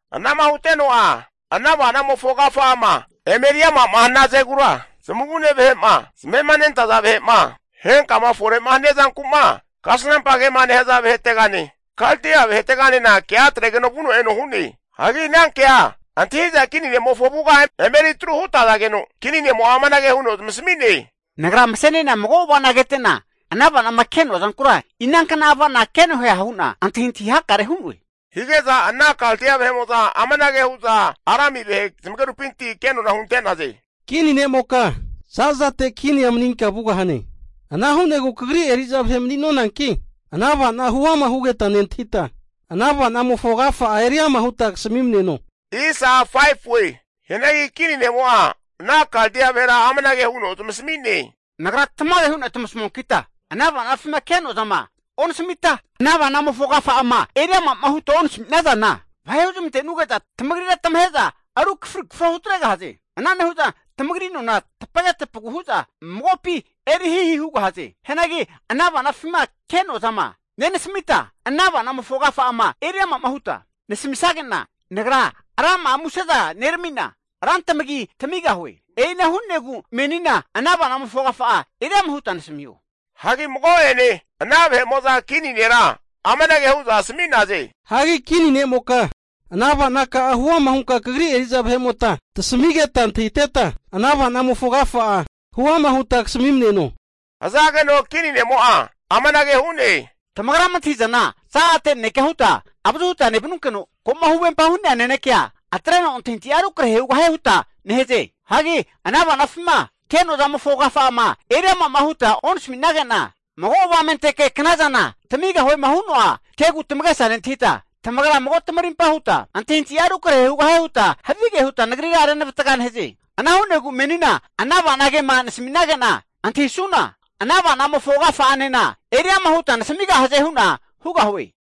Anama huteno'a ana ava'namofo agafa'ama eme eriama'ma hanazegura, zamavune vahe'ma, zamema nentaza vahe'ma, henkama fore hania zanku'ma kasnampagema nehaza vahetegane Kaldia vaheteganena kea atregeno vuno eno hu'ne. Hagi ana kea antahi'za kini ne'mofo avuga emeri atru hutazageno, Kini ne'mo'a amanage huno zamasami'ne, Nagra mase'ne'na mago ava'na kete'na, ana avanama ke'noa zankura inankna avana ke'noeha hu'na antahintahi hakare hu'noe. Hige'za ana Kaldia vahe'mo'za amanage hu'za Arami vahe zamagerupinti kenona'a hunte'naze. Kini ne'moka za'zate kinia maninka vugahane. Ana hu'negu kagri eri'za vahe mani'nonanki, ana ava'na huama hugeta nentahita, ana ava'namofo agafa'a eriama huta kasamineno! Hianagi kini ne'mo'a ana Kaldia vahera amanage huno zamasami'ne. Nagra tamage hu'na tamasamuankita, ana ava'nafima ke'noa zama onasamita, ana avana'mofo agafa'ama eri ama'ma huta onasami'nazana, vahe huzmante'nuge'za tamagrira tamahe'za rukafri kafro hutregahaze. Ana nehu'za tamagri nona tapage tapagu hu'za magopi eri hihi hugahaze. Hianagi ana ava'nafima ke'noa zama nenasamita, ana ava'namofo agafa'ama eri ama'ma huta nasamisage'na, nagra rama'a museza nerami'na rantamagi tamigahue. E'ina hu'negu menina ana avanamofo agafa'a eriama huta nasamiho. Hagi mago'ene ana vahe'mo'za kini nera amanage hu'za asami'naze. Hagi kini ne'moka, ana avanaka'a huama hunka kagri eri'za vahe'mota tasamitegeta antahiteta, ana ava'namofo agafa'a huama huta kasami'neno. Hazageno kini ne'mo'a amanage hu'ne, tamagrama antahi'zana zazate nanekea huta avazu huta nevanunkeno, ko'ma huvempama hu'nea nanekea atreno antahintahi'a rukrahe hugahie huta nehaze. Hagi ana ava'nafima ke'noa zamofo agafa'ama eri ama'ma huta onasaminage'na, mago avamenteke knazana tamigahuema hu'noa kegu tamagesa nentahita, tamagra mago tamarimpa huta, antahintahi'a rukrahe hugahie huta havige huta nagrira renavatga nehaze. Ana hu'negu menina ana avana kema nasami'nage'na antahisuna, ana avana'mofo agafa'anena eri ama huta nasamigahaze hu'na hugahue.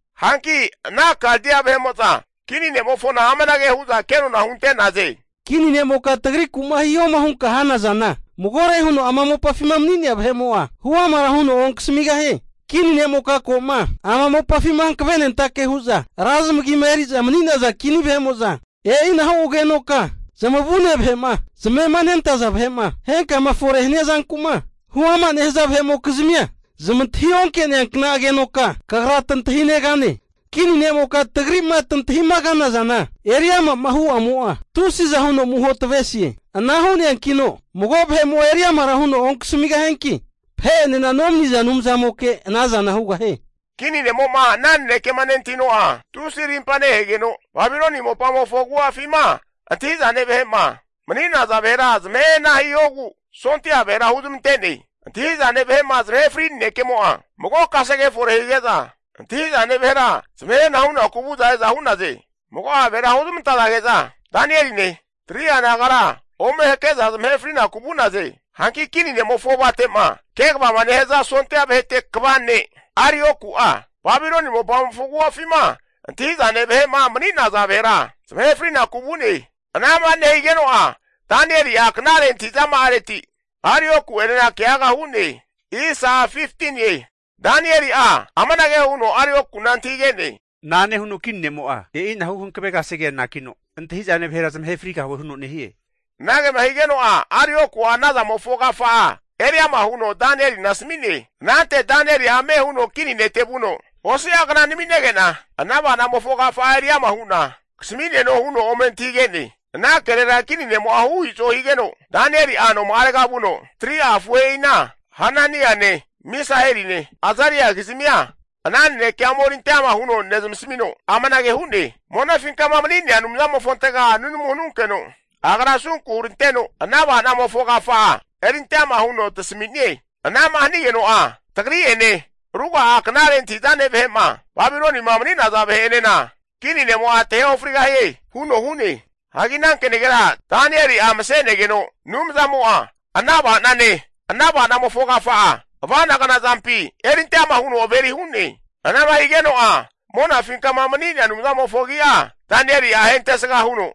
Hanki ana Kaldia vahe'mo'za kini ne'mofona amanage hu'za kenona hunte'naze. Kini ne'moka tagriku'ma hihoma hunkama hana zana, magore huno ama mopafima mani'nea vahe'mo'a huamara huno onkasamigahie. Kini ne'moka ko'ma ama mopafima hankavenentake hu'za ra zamagima eri'za mani'naza kini vahe'mo'za, e'inahu agenoka zamavune vahe'ma, zamema nentaza vahe'ma, henkama fore hania zanku'ma huama nehaza vahe'mokizmia zamantahi onke'nazankna agenoka kagra tantahinegane. Kini ne'moka tagri'ma tantahimagana zama eri ama'ma hu'amo'a, tusiza huno amuho tavesie. Ana hu'neankino mago vahe'mo'a eri amara huno onkasamigahianki, vahe'enena nomaniza anumzantamimoke ana zana eri amara hugahie. Kini nemo'ma ana nanekema nentahino'a, tusi arimpa nehegeno, Babiloni mopamofo agu'afima antahi'zane vahe'ma mani'naza vahera zamahe hana hihogu sondia vahera huzmante'ne. Antahi'zane vahe'ma zamahe fri nanekemo'a mago kasege efore hige'za, antahi'zane vahera zamahe hana hunaku vu'za e'za hu'naze. Ana nehazage'za mago'a vahera huzmantazage'za Danieline 3'a nagara ome hake'za zamahe frinaku vu'naze. Hanki kini ne'mofo avate'ma kegavama nehaza sondia vahete kva ne' Arioku'a, Babiloni mopamofo agu'afima antahi'zane vahe'ma mani'naza vahera zamahe fri'naku vu'ne. Anama nehigeno'a Danieli'a knare antahi'zama'areti Arioku'enena keaga hu'ne. Danieli'a amanage huno Arioku'na antahige'ne. Na'ane huno kini ne'mo'a e'ina hu hankave kasegea anakino, antahi'zane vahera zamahe frigahue huno nehie? Anagema higeno'a Arioku'a anazamofo agafa'a eriama huno Danielina asami'ne. Anante Danieli'a ame huno kini nete vuno, Osi'a kna naminege'na ana ava'namofo agafa'a eriama hu'na kasami'neno huno ome antahige'ne. Ana kerera kini ne'mo'a hu i'zo higeno, Danieli'a noma'arega vuno 3'a afuhe'ina Hananiane, Misaheline, Azaria kizmia ana nanekea omerinte ama huno nezmasamino, amanage hu'ne, monafinkama mani'nea Anumzamofontega nunamu hanunkeno, agra asunku huneranteno ana ava'namofo agafa'a erinte ama huno tasami'nie. Anama hanigeno'a tagri'ene, ruga'a knare antahi'zane vahe'ma Babilonima mani'naza vahe'enena kini ne'mo'a tahe ofrigahie huno hu'ne. Hagi ana kenagera Danieli'a mase'negeno, Anumzamo'a ana ava'nane, ana avanamofo agafa'a, ava'nagna zampi erinte ama huno averi hu'ne. Anama higeno'a monafinkama mani'nea Anumzamofo agi'a Danieli'a ahentesga huno,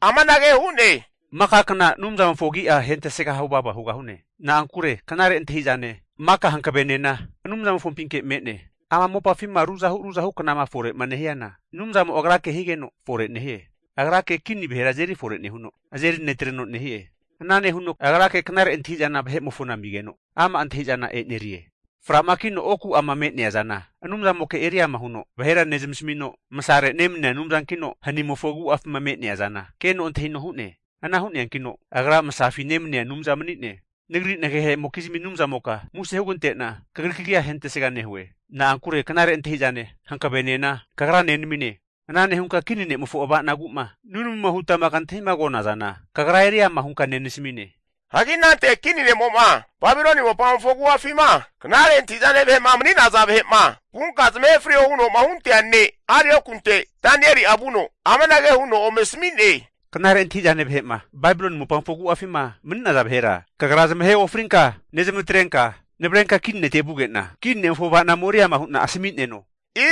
amanage hu'ne, Maka kna Anumzamofo agi'a ahentesga huvava hugahune. Na'ankure knare antahi'zane, maka hankavenena Anumzamofopinke me'ne. Ama mopafima ruzahu ruzahu knama fore'ma nehiana, Anumzamo Agrake higeno fore nehie. Agrake kini vahera azeri fore nehuno, azeri netreno nehie. Ana nehuno Agrake knare antahi'zana vahe'mofona amigeno ama' antahi'zana enerie. Framakino oku'ama me'nea zana Anumzamoke eri ama huno vahera nezamasamino, masare nemania Anumzankino hanimofo agu'afima me'nea zana keno antahino hu'ne. Ana hu'neankino Agra masafi nemania Anumza mani'ne. Nagri nagehe'mokizmi Anumzamoka muse hunegante'na Kagri kagia ahentesga nehue. Na'ankure knare antahi'zane, hankavenena Kagra nenamine. Ana nehunka kini ne'mofo ava'nagu'ma nunamuma hutama kantahigona zana, Kagra eri ama' hunka nasami'ne. Hagi anante kini ne'mo'ma Babiloni mopamofo agu'afima knare antahi'zane vahe'ma mani'naza vahe'ma vunka zamahe frio huno'ma hunte'nea ne' Ariokunte Danieli'a vuno, amanage huno ome asami'ne. Knare antahi'zane vahe'ma Babiloni mopamofo agu'afima mani'naza vahera kagra zamahe ofrinka nezmantrenka navrenka kini nete vuge'na, kini ne'mofo ava'na ome eriama hu'na asami'neno.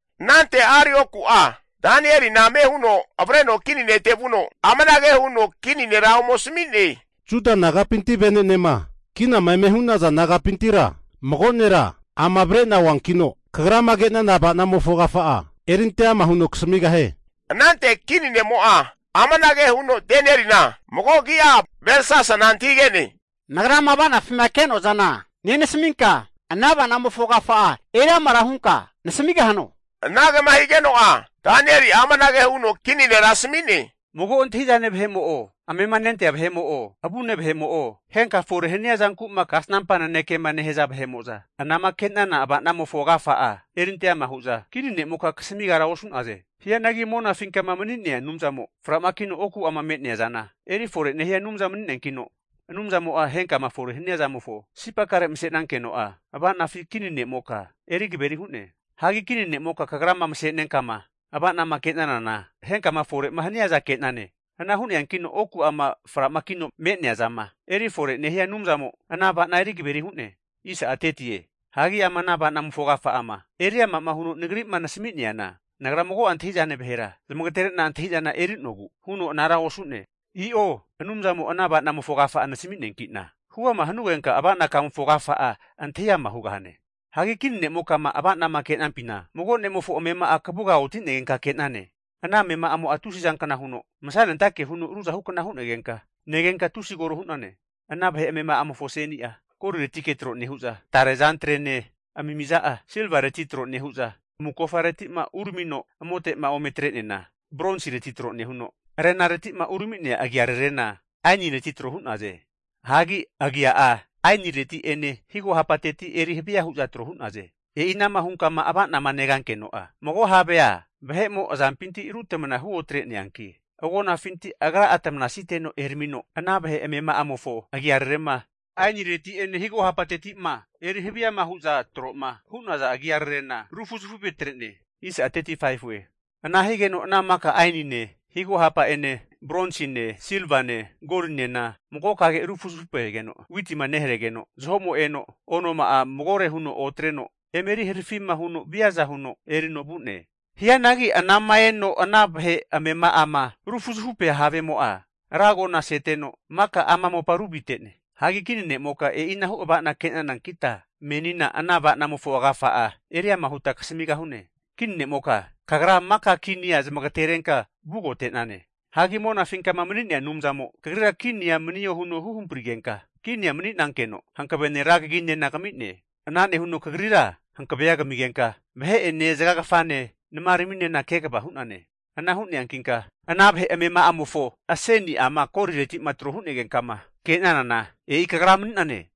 Anante Arioku'a, Danielina ame huno avreno kini nete vuno, amanage huno kini nera ome asami'ne. Juda nagapinti vene'nema kinama eme hu'naza nagapintira mago nera ama hakena avre'na oankino, kagrama ke'nana ava'namofo agafa'a erinte ama huno kasamigahie. Anante kini ne'mo'a amanage huno Danielina mago agi'a Belsasana antahige'ne. Nagrama ava'nafima ke'noa zana nenasaminka, ana ava'namofo agafa'a eri amara hunka nasamigahano? Anagema higeno'a Danieli'a amanage huno kini nera asami'ne. Mago antahi'zane vahemo'o, amema nentea vahemo'o, avune vahe'mo'o, henka fore hania zanku'ma kasnampa nanekema nehaza vahe'mo'za, anama ke'nana ava'namofo agafa'a erinte ama hu'za kini nemoka kasamigara osu'naze. Hianagi monafinkama mani'nea Anumzamo, fra'ma kino oku'ama me'nea zana eri fore nehia Anumza mani'neankino, Anumzamo'a henkama fore hania zamofo sipakare'ma masenankeno'a ava'nafi kini ne'moka eri kaveri hu'ne. Hagi kini ne'moka kagrama mase'nenka'ma ava'nama ke'nanana, henkama fore'ma haniaza ke'nane. Ana hu'neankino oku'ama framakino me'nea zama erifore nehia Anumzamo, ana ava'na eri kaveri hu'ne. Hagi ama ana ava'namofo agafa'ama eriama'ma huno nagri'ma nasami'neana, nagra mago'a antahi'zane vahera zamagatere'na, antahi'zana eri'nogu huno anara osu'ne, i'o. Anumzamo ana ava'namofo agafa'a nasami'neanki'na, huama hanugenka ava'na kamofo agafa'a antahi ama' hugahane. Hagi kini ne'mokama ava'nama ke'nampina, mago ne'mofo amema'a kavuga oti'negenka ke'nane. Ana amema'amo'a tusizankna huno masanentake huno ruzahukna hu'negenka negenka tusi koro hu'nane. Ana vahe amema'amofo aseni'a goliretike tro nehu'za, tare azantrene amimiza'a silvareti tro nehu'za, amukofareti'ma uramino amote'ma ome atre'neana, bronsireti tro nehuno, arenareti'ma urami'nea agiararena ainireti tro hu'naze. Hagi agia'a ainireti'ene higo hapateti eri havia huza tro hu'naze. E'i anama hunkama avanama negankeno'a, mago havea vahe'mo azampinti rutamana huotre'neaki, agonafinti agra'a atamanasiteno eramino, ana vahe amema'amofo agiararema, ainireti'ene higo hapatetima eri haviama hu'za tro'ma hu'naza agia rarena rufuzafupetre'ne. Ana higeno ana maka ainine, higo hapa'ene, bronsine, silvane, golinena magokage rufuzufupegeno, witima neharegeno zaho'mo eno, onoma'a magore huno otreno eme eri harafima huno viaza huno erino vu'ne. Hianagi anama eno ana vahe amema'ama rufuzafupea havemo'a, ra agona seteno maka ama mopa ruvite'ne. Hagi kini ne'moka e'inahu ava'na ke'nanankita menina ana ava'namofo agafa'a eriama huta kasamigahune. Kini ne'moka, kagra maka kinia zamagaterenka vugote'nane. Hagi monafinkama mani'nea Anumzamo kagrira kinia manio huno huhamprigenka kinia mani'nankeno hankavene rankaginena kami'ne. Ana nehuno kagrira hankavea kamigenka vahe'ene zaga kfane namaraminena kegava hu'nane. Ana hu'neankinka ana vahe amema'amofo aseni'ama golireti'ma tro hu'nagenka'ma kenanana, e'i kagra mani'nane.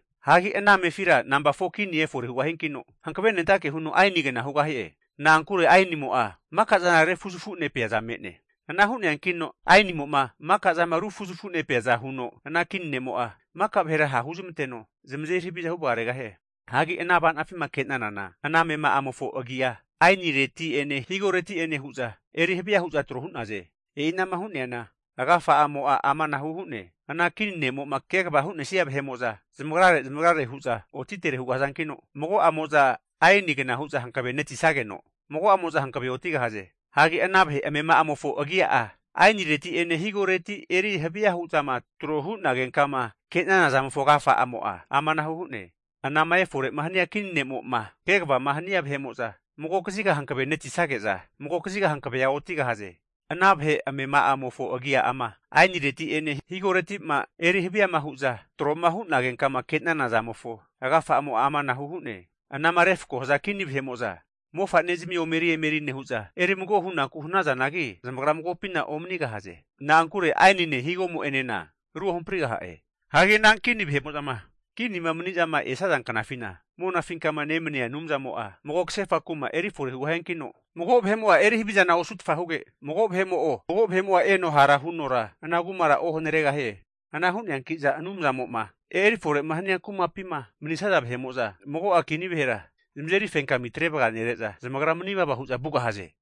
Hagi ana amefira nampa 4kini efore hugahiankino, hankavenentake huno ainigna hugahie. Na'ankure ainimo'a maka'zana rufuzafu'nepeaza me'ne. Ana hu'neankino ainimo'ma maka'zama rufuzafunepeaza huno, ana kini ne'mo'a maka vahera hahu zamanteno zamazeri haviza huvagaregahie. Hagi ana ava'nafima ke'nanana, ana amema'amofo agia ainireti'ene higoreti'ene eri havia hu'za tro hu'naze. E'inama hu'neana, agafa'amo'a amanahu hu'ne. Ana kini ne'mo'ma kegavama hu'nesnia vahe'mo'za zamagrare zamagrare hu'za otitere hugahazankino, mago'amoza aenigna huza hankavenetisageno, mago'amo'za hankave otigahaze. Hagi ana vahe amema'amofo agia'a ainireti'ene higoreti eri haviama hu'za tro hu'nagenkama ke'nana zamofo agafa'amo'a amanahu hu'ne. Anama efore'ma hania kini nemo'ma kegavama hania vahe'mo'za, mago kaziga hankave netiszage'za, mago kaziga hankavea otigahaze. Ana vahe amema'amofo agiama ainireti'ene higoreti'ma eri haviama hu'za tro'ma hu'nagenka'ma ke'nana zamofo agafa'amo'a amanahu hu'ne. Anama refko haza kini vahe'mo'za mofa'nezmi omeri emeri nehu'za, eri mago hunaku hanazanagi, zamagra magopina omanigahaze. Na'ankure ainine higomo'enena ruohamprigaha'e. Hagi anankini vahe'mo'zama kinima mani'zama esnaza knafina, Monafinkama nemania Anumzamo'a mago kasefa kuma (Kindom) erifore hugahiankino, mago vahe'mo'a eri havizana osutfa huge, mago vahe'mo'a eno hara hunora ana kumara ohanaregahie. Ana hu'neanki'za Anumzamo'ma eri fore hania kumapima mani'snaza vahe'mo'za, mago'a kini vahera zamazeri fenkami atre vaganere'za, zamagra manivava hu'za vugahaze.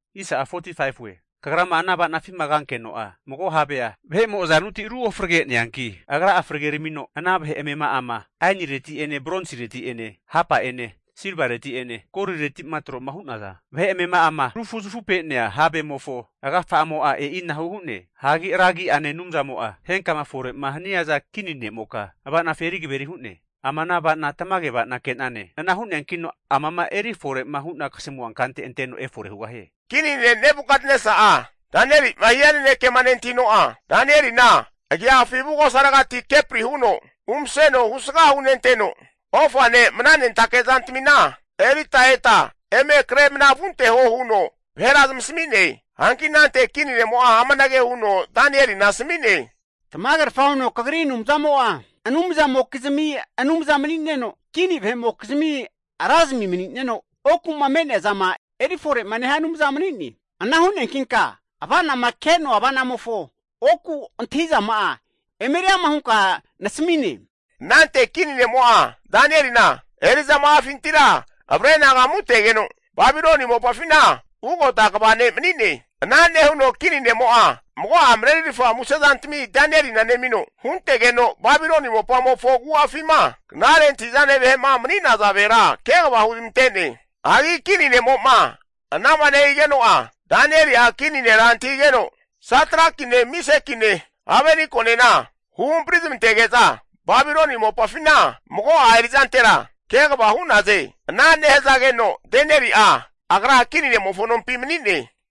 Kagrama ana ava'nafima kankeno'a, mago havea vahe'mo azanuti ruofregeneanki, agra'a frageramino ana vahe amema'ama ainireti'ene bronsireti'ene hapa'ene silvareti'ene golireti'ma tro'ma hu'naza vahe amema'ama rufuzafupe'nea havemofo agafa'amo'a e'inahu hu'ne. Hagi Ra agi'ane Anumzamo'a henkama fore'ma haniaza kini nemoka ava'nafi eri kaveri hu'ne. Ama ana ava'na tamage ava'na ke'nane. Ana hu'neankino amama eri fore'ma hu'na kasamua kante anteno efore hugahie. Kini ne' Nebukatnesa'a Danieli'ma hia nanekema nentahino'a, Danielina agiafi avugosaregati kepri huno umaseno husga hunenteno, ofane mna nentake zantamina erita eta eme kre mna vunteho huno vahera zamasami'ne. Hanki anante kini ne'mo'a amanage huno Danielina asami'ne. Tamagerfa huno kagri Anumzamo'a anumzamokizmi Anumza mani'neno, kini vahe'mokizmi Razami mani'neno, oku'ma me'nea zama eri fore'ma nehia Anumza mani'ne. Ana hu'neankinka ava'nama ke'noa ava'namofo oku antahi'zama'a emeri ama hunka nasami'ne. Anante kini ne'mo'a Danielina eri'zama'afintira avre anagamutegeno Babiloni mopafina ugota kva ne' mani'ne. Ana nehuno kini nemo'a mago'a marerirfa musezantami Danielina nemino, huntegeno Babiloni mopamofo agu'afima knare antahi'zane vahe'ma mani'naza vahera kegava huzmante'ne. Hagi kini ne'mo'ma anama nehigeno'a Danieli'a kini nera antahigegeno, Satrakine, Mesakine, Abetnekonena huhampri zamantege'za, Babiloni mopafina mago'a eri'zantera kegava hu'naze. Ana nehazageno Danieli'a agra kini ne'mofo nompi mani'ne.